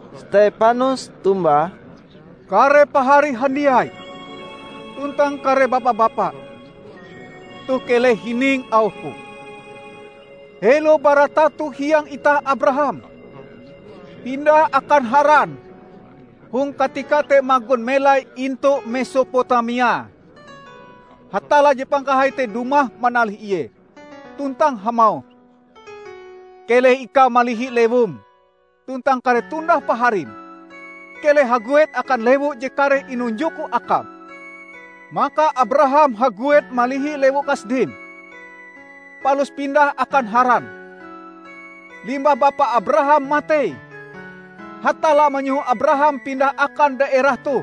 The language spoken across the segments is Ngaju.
Stepanus tombah, "Kare pahari handiai tuntang kare bapa-bapa! Toh keleh hining auhku! Helo bara tato hiang itah Abraham pindah akan Haran hong katika te magon melai intu Mesopotamia, Hatalla Je Pangkahai te dumah manalih ie tuntang hamauh, 'Keleh ikau malihi lewum tuntang kare tundah-paharim. Keleh haguet akan lewu je kareh inunjokku akam.' Maka Abraham haguet malihi lewu Kasdim, palus pindah akan Haran. Limbah bapa Abraham matei, Hatalla manyoho Abraham pindah akan daerah toh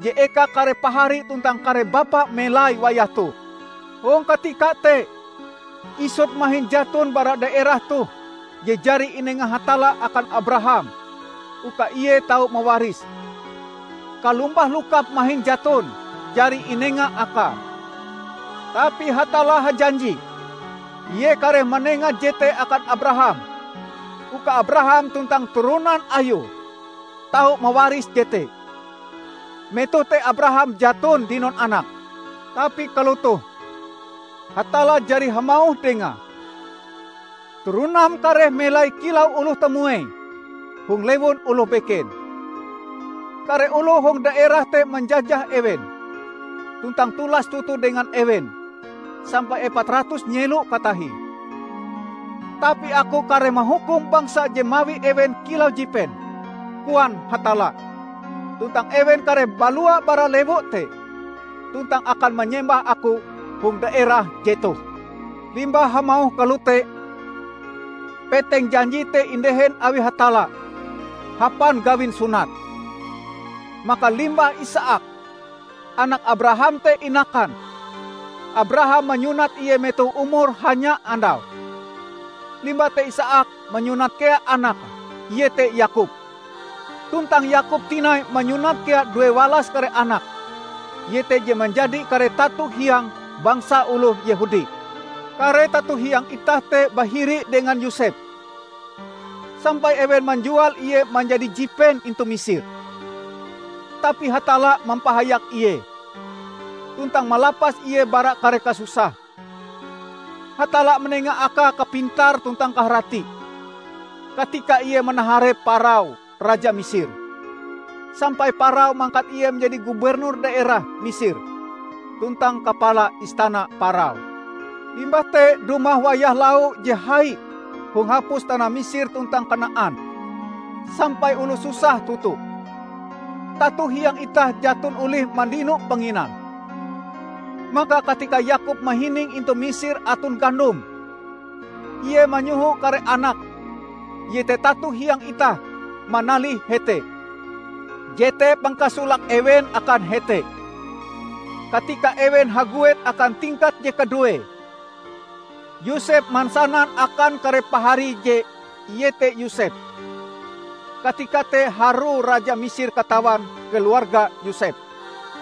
je eka kare pahari tuntang kare bapa melai wayah toh. Hong katika te isut mahin jaton bara daerah toh je jari inenga Hatalla akan Abraham uka ie tau mawarise; kalombah lokap mahin jaton jari inenga akae. Tapi Hatalla hajanji ie kareh manenga jete akan Abraham uka Abraham tuntang turonan ayue tau mawaris jete. Metoh te Abraham jaton dinon anak. Tapi kalotoh Hatalla jari hamauh dengae, 'Turonam kareh melai kilau oloh tamuei hong lewun oloh beken. Kare oloh hong daerah te manjajah ewen tuntang tulas toto dengan ewen sampai epat ratus nyelo katahie. Tapi aku kareh mahukum bangsa je mawi ewen kilau jipen,' koan Hatalla, 'tuntang ewen kareh balua bara lewu te tuntang akan manyembah Aku hong daerah jetoh.' Limbah hamauh kalote peteng janji te indehen awi Hatalla hapan gawin sunat. Maka limbah Isaak, anak Abraham te inakan, Abraham manyunat ie metoh umure hanya andau. Limbah te Isaak manyunat kea anake, iete Yakob. Tuntang Yakob tinai manyunat kea due walas kare anake, iete je manjadi kare tato hiang bangsa oloh Yehudi. Kare tato hiang itah te bahiri dengan Yosep, sampai ewen manjual ie manjadi jipen intu Misir. Tapi Hatalla mampahayak ie, tuntang malapas ie bara kare kasusahe. Hatalla manenga akae kapintar tuntang kaharati katika ie manaharep Parao raja Misir, sampai Parao mangkat ie manjadi Gubernur daerah Misir tuntang kapala istana Parao. Limbah te dumah wayah lau je hai hong hapus tanah Misir tuntang Kanaan sampai oloh susah toto. Tato hiang itah jaton olih mandino panginan. Maka katika Yakob mahining intu Misir aton gandom, ie manyoho kare anake, iete tato hiang itah, manalih hete. Jete pangkasolake ewen akan hete. Katika ewen haguet akan tingkat je kaduee, Yosep mansanan akan kare paharie je ie te Yosep. Katika te harue raja Misir katawan keluarga Yosep.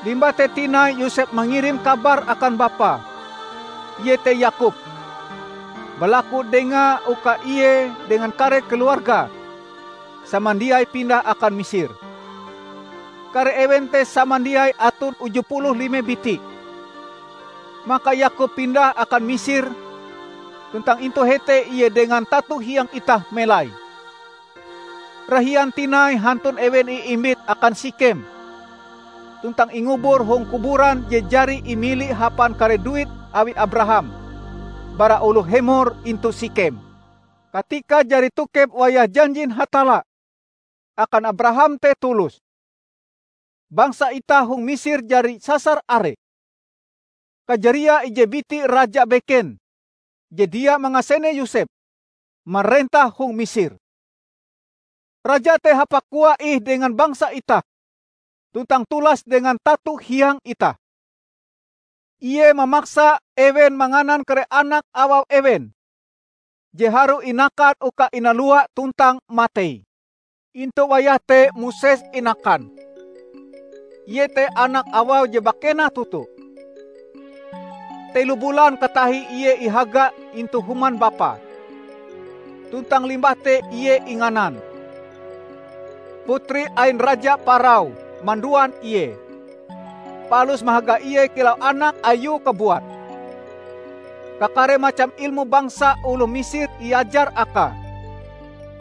Limbah te tinai Yosep mangirim kabar akan bapae, iete Yakob, balaku dengae uka ie dengan kare keluargae samandiai pindah akan Misir -- kare ewen te samandiai aton uju puluh lime biti. Maka Yakob pindah akan Misir tuntang intu hete ie dengan tato hiang itah melai. Rahian tinai hantun ewen iimbit akan Sikhem tuntang ingubur hong kuburan je jari imili hapan kare duit awi Abraham bara oloh Hemor intu Sikhem. Katika jari tokep wayahe janjin Hatalla akan Abraham te tulus, bangsa itah hong Misir jari sasar are. Kajariae ije biti raja beken je dia mangasene Yosep, marentah hong Misir. Raja te hapakoae ih dengan bangsa itah tuntang tulas dengan tato hiang itah. Ie mamaksa ewen manganan kare anak awau ewen je harue inakan uka inalua tuntang matei. Intu wayah te Moses inakan; ie te anak awau je bakena toto. Telo bulan katahie ie ihaga intu human bapae, tuntang limbah te ie inganan. Putri ain Raja Parao manduan ie, palus mahaga ie kilau anak ayue kabuat. Kakare macam ilmu bangsa oloh Misir iajar akae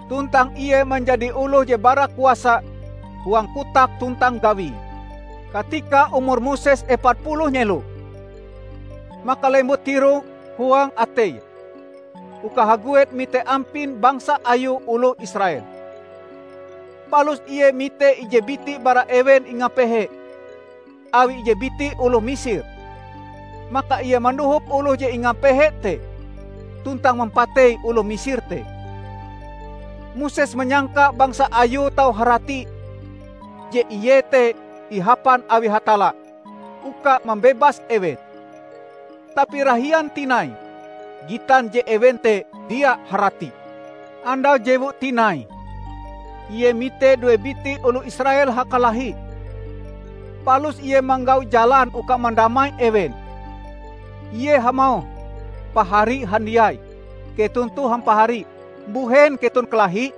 tuntang ie manjadi oloh je bara kuasa huang kotak tuntang gawie. Katika umur Moses epat puluh nyelo maka lembut tirok huang ateie uka haguet mite ampin bangsa ayue oloh Israel. Palus ie mite ije biti bara ewen ingapehe awi ije biti oloh Misir; maka ie mandohop oloh je ingapehe te tuntang mampatei oloh Misir te. Moses manyangka bangsa ayue tau harati je ie te ihapan awi Hatalla uka mambebas ewen. Tapi rahian tinai gitan je ewen te dia haratie. Andau jewue tinai ie mite due biti oloh Israel hakalahi, palus ie manggau jalan uka mandamai ewen. Ie hamauh, 'Pahari handiai, keton toh hampahari. Mbuhen keton kalahi?'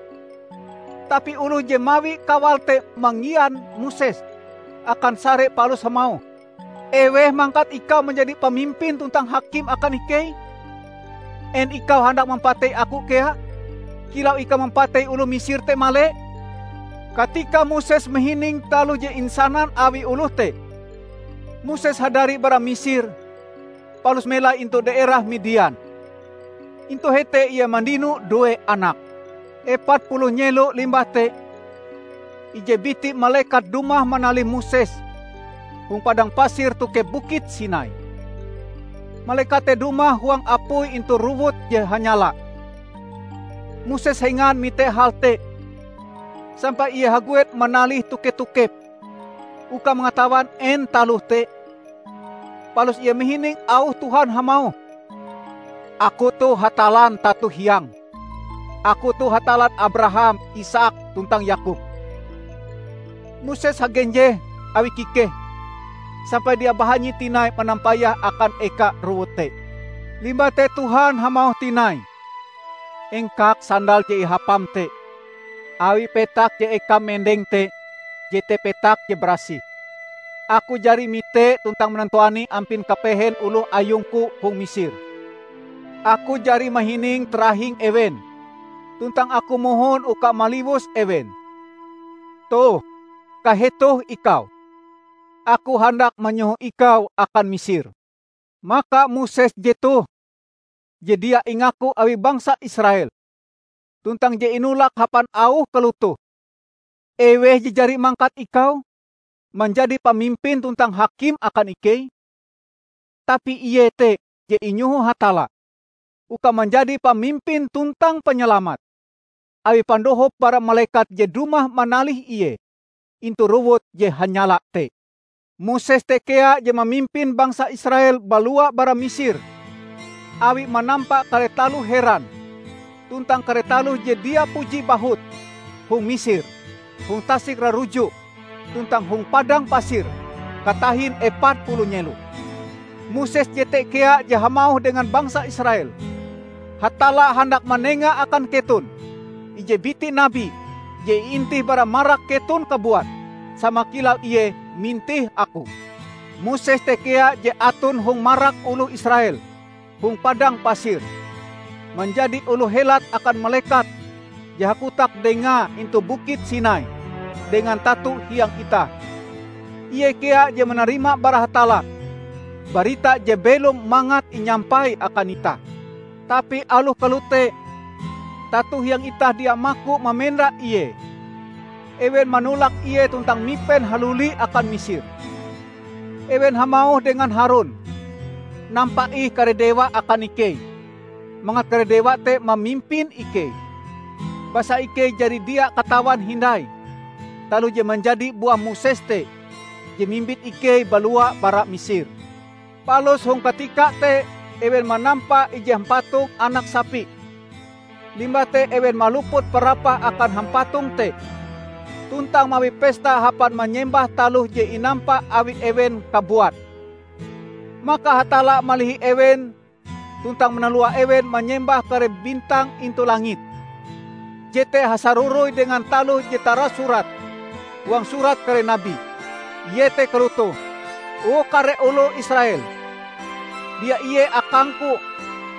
Tapi oloh je mawi kawale te manggian Moses akan sare palus hamauh, 'Eweh mangkat ikau manjadi pamimpin tuntang hakim akan ikei? En ikau handak mampatei aku kea kilau ikau mampatei oloh Misir te male?' Katika Moses mahining taloh je insanan awi oloh te, Moses hadari bara Misir palus melai intu daerah Midian. Intu hete ie mandino due anak. Epat puluh nyelo limbah te ije biti malekat dumah manalih Moses hong padang pasir tokep Bukit Sinai. Malekat te dumah huang apui intu rowut je hanyala. Moses hengan mite hal te, sampai ie haguet manalihe toke-tokep uka mangatawan en taloh te. Palus ie mahining auh Tuhan hamauh, 'Aku toh Hatallan tato hiangm; Aku toh Hatallan Abraham, Isaak, tuntang Yakob.' Moses hagenjeh awi kikehe sampai dia bahanyi tinai manampayah akan eka rowut te. Limbah te Tuhan hamauh tinai, 'Engkak sandal je ihapam te, awi petak je ekam mendeng te jete petak je barasih. Aku jari mite tuntang manantuani ampin kapehen oloh ayung-Ku hong Misir. Aku jari mahining tarahing ewen tuntang Aku mohon uka maliwus ewen. Toh, kahetoh ikau! Aku handak manyoho ikau akan Misir.' Maka Moses jetoh je dia ingaku awi bangsa Israel tuntang je inolak hapan auh kalotoh, 'Eweh je jari mangkat ikau manjadi pamimpin tuntang hakim akan ikei?' Tapi ie te je inyoho Hatalla uka manjadi pamimpin tuntang panyalamat, awi pandohop bara malekat je dumah manalih ie intu rowut je hanyala te. Moses te kea je mamimpin bangsa Israel balua bara Misir awie manampa kare taloh heran tuntang kare taloh je dia puji bahut hong Misir, hong Tasik Raruju tuntang hong padang pasir katahin epat puluh nyelo. Moses jete kea je hamauh dengan bangsa Israel, 'Hatalla handak manenga akan keton ije biti nabi je iintih bara marak keton kabuat, sama kilau ie mintih aku.' Moses te kea je aton hong marak oloh Israel hong padang pasir, manjadi oloh helat akan malekat je hakotak dengae intu Bukit Sinai dengan tato hiang itah. Ie kea je manarima bara Hatalla barita je belom mangat inyampai akan itah. Tapi aloh kalote tato hiang itah dia maku mamenda ie. Ewen manolak ie tuntang mipen haluli akan Misir. Ewen hamauh dengan Harun, 'Nampa ih kare dewa akan ikei, mangat kare dewa te mamimpin ikei. Basa ikei jari dia katawan hindai taloh je manjadi buah Moses te je mimbit ikei balua bara Misir!' Palus hong katika te ewen manampa ije hampatong anak sapi, limbah te ewen maluput parapah akan hampatong te tuntang mawi pesta hapan manyembah taloh je inampa awi ewen kabuat. Maka Hatalla malihi ewen tuntang manalua ewen manyembah kare bintang intu langit. Jete hasaroroi dengan taloh je tarasurat huang surat kare nabi. Iete kalotoh, 'O kare oloh Israel! Dia ie akang-Ku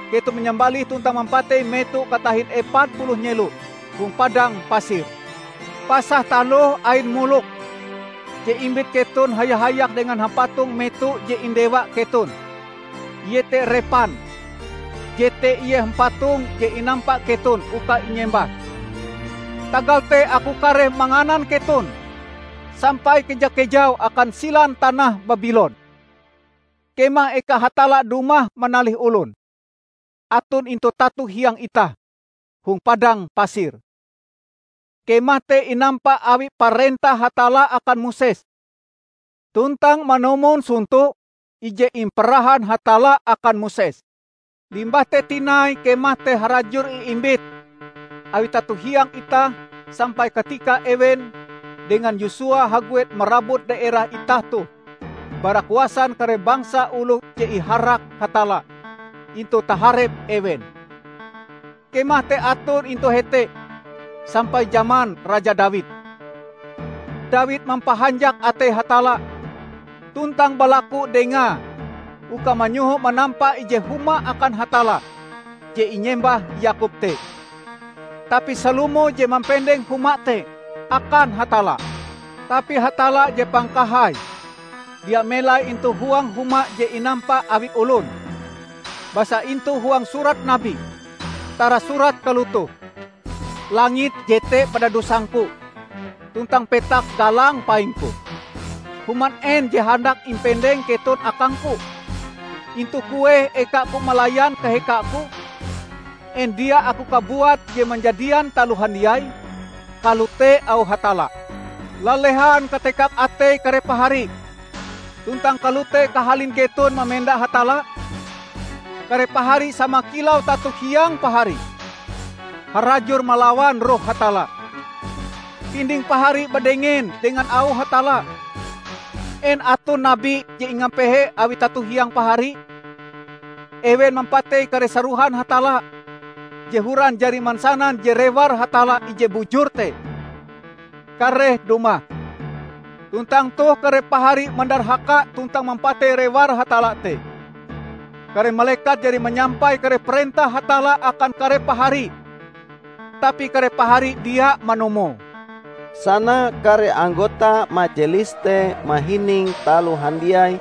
keton manyambalih tuntang mampatei meto katahin epat puluh nyelo hong padang pasir. Pasah taloh ain Molok je imbit keton haya-hayak dengan hampatong meto je indewa keton, iete Repan; Jete ie hampatong je inampa keton uka inyembah. Tagal te aku kareh manganan keton sampai keja-kejau akan silan tanah Babilon.' Kemah eka Hatalla dumah manalih olon aton intu tato hiang itah hong padang pasir. Kemah te inampa awi parentah Hatalla akan Moses tuntang manumon sonto je imparahan Hatalla akan Moses. Limbah te tinai kemah te harajur iimbit awi tato hiang itah sampai katika ewen dengan Yosua haguet marabut daerah itah toh bara kuasan kare bangsa oloh je iharak Hatalla intu taharep ewen. Kemah te aton intu hete sampai jaman raja Dawid. Dawid mampahanjak atei Hatalla tuntang balaku dengae uka manyoho manampa ije huma akan Hatalla je inyembah Yakob te. Tapi Salomo je mampendeng huma te akan Hatalla. Tapi Hatalla Je Pangkahai dia melai intu huang huma je inampa awi olon; basa intu huang surat nabi tarasurat kalotoh, 'Langit jete padadusang-Ku, tuntang petak galang paing-Ku. Human en je handak impendeng keton akang-Ku? Intu kueh eka-Ku malayan kaheka-Ku? En dia Aku kabuat je manjadian taloh handiai?' Kalote auh Hatalla. Lalehan katekang atei kare pahari tuntang kalote kahalin keton mamenda Hatalla! Kare pahari sama kilau tato hiang pahari; harajur malawan Roh Hatalla! Pinding pahari badengen dengan auh Hatalla! En aton nabi je ingapehe awi tato hiang pahari? Ewen mampatei kare sarohan Hatalla je horan jari mansanan je Rewar Hatalla Ije Bujur te kareh dumah. Tuntang toh kare pahari mandarhaka tuntang mampatei Rewar Hatalla te. Kare malekat jari manyampai kare parentah Hatalla akan kare pahari, tapi kare pahari dia manumoe!" Sana kare anggota majelis te mahining taloh handiai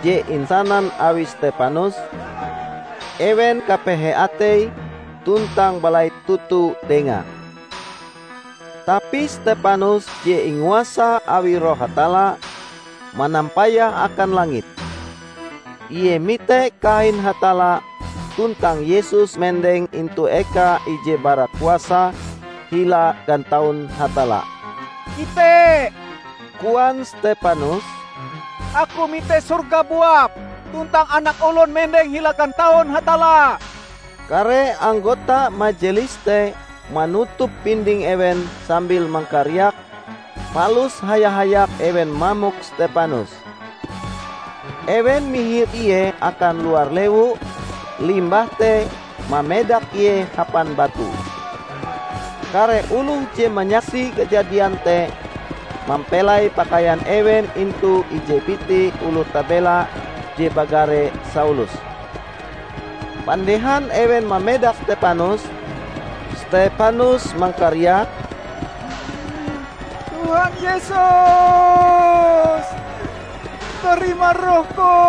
je insanan awi Stepanus, ewen kapehe ateie tuntang balait toto dengae. Tapi Stepanus je inguasa awi Roh Hatalla, manampayah akan langit. Ie mite kahain Hatalla tuntang Yesus mendeng intu eka ije bara kuasa hila gataun Hatalla. "Ite," koan Stepanus, "aku mite sorga buap tuntang Anak Olon mendeng hila gantaun Hatalla!" Kare anggota majelis te manutup pinding ewen sambil mangkariak, palus haya-hayak ewen mamok Stepanus. Ewen mihir ie akan luar lewu limbah te mamedak ie hapan batu. Kare oloh je manyaksi kajadian te mampelai pakaian ewen intu ije biti oloh tabela je bagare Saulus. Pandehan ewen mamedak Stepanus, Stepanus mangkariak, "Tuhan Yesus, tarima rohku!"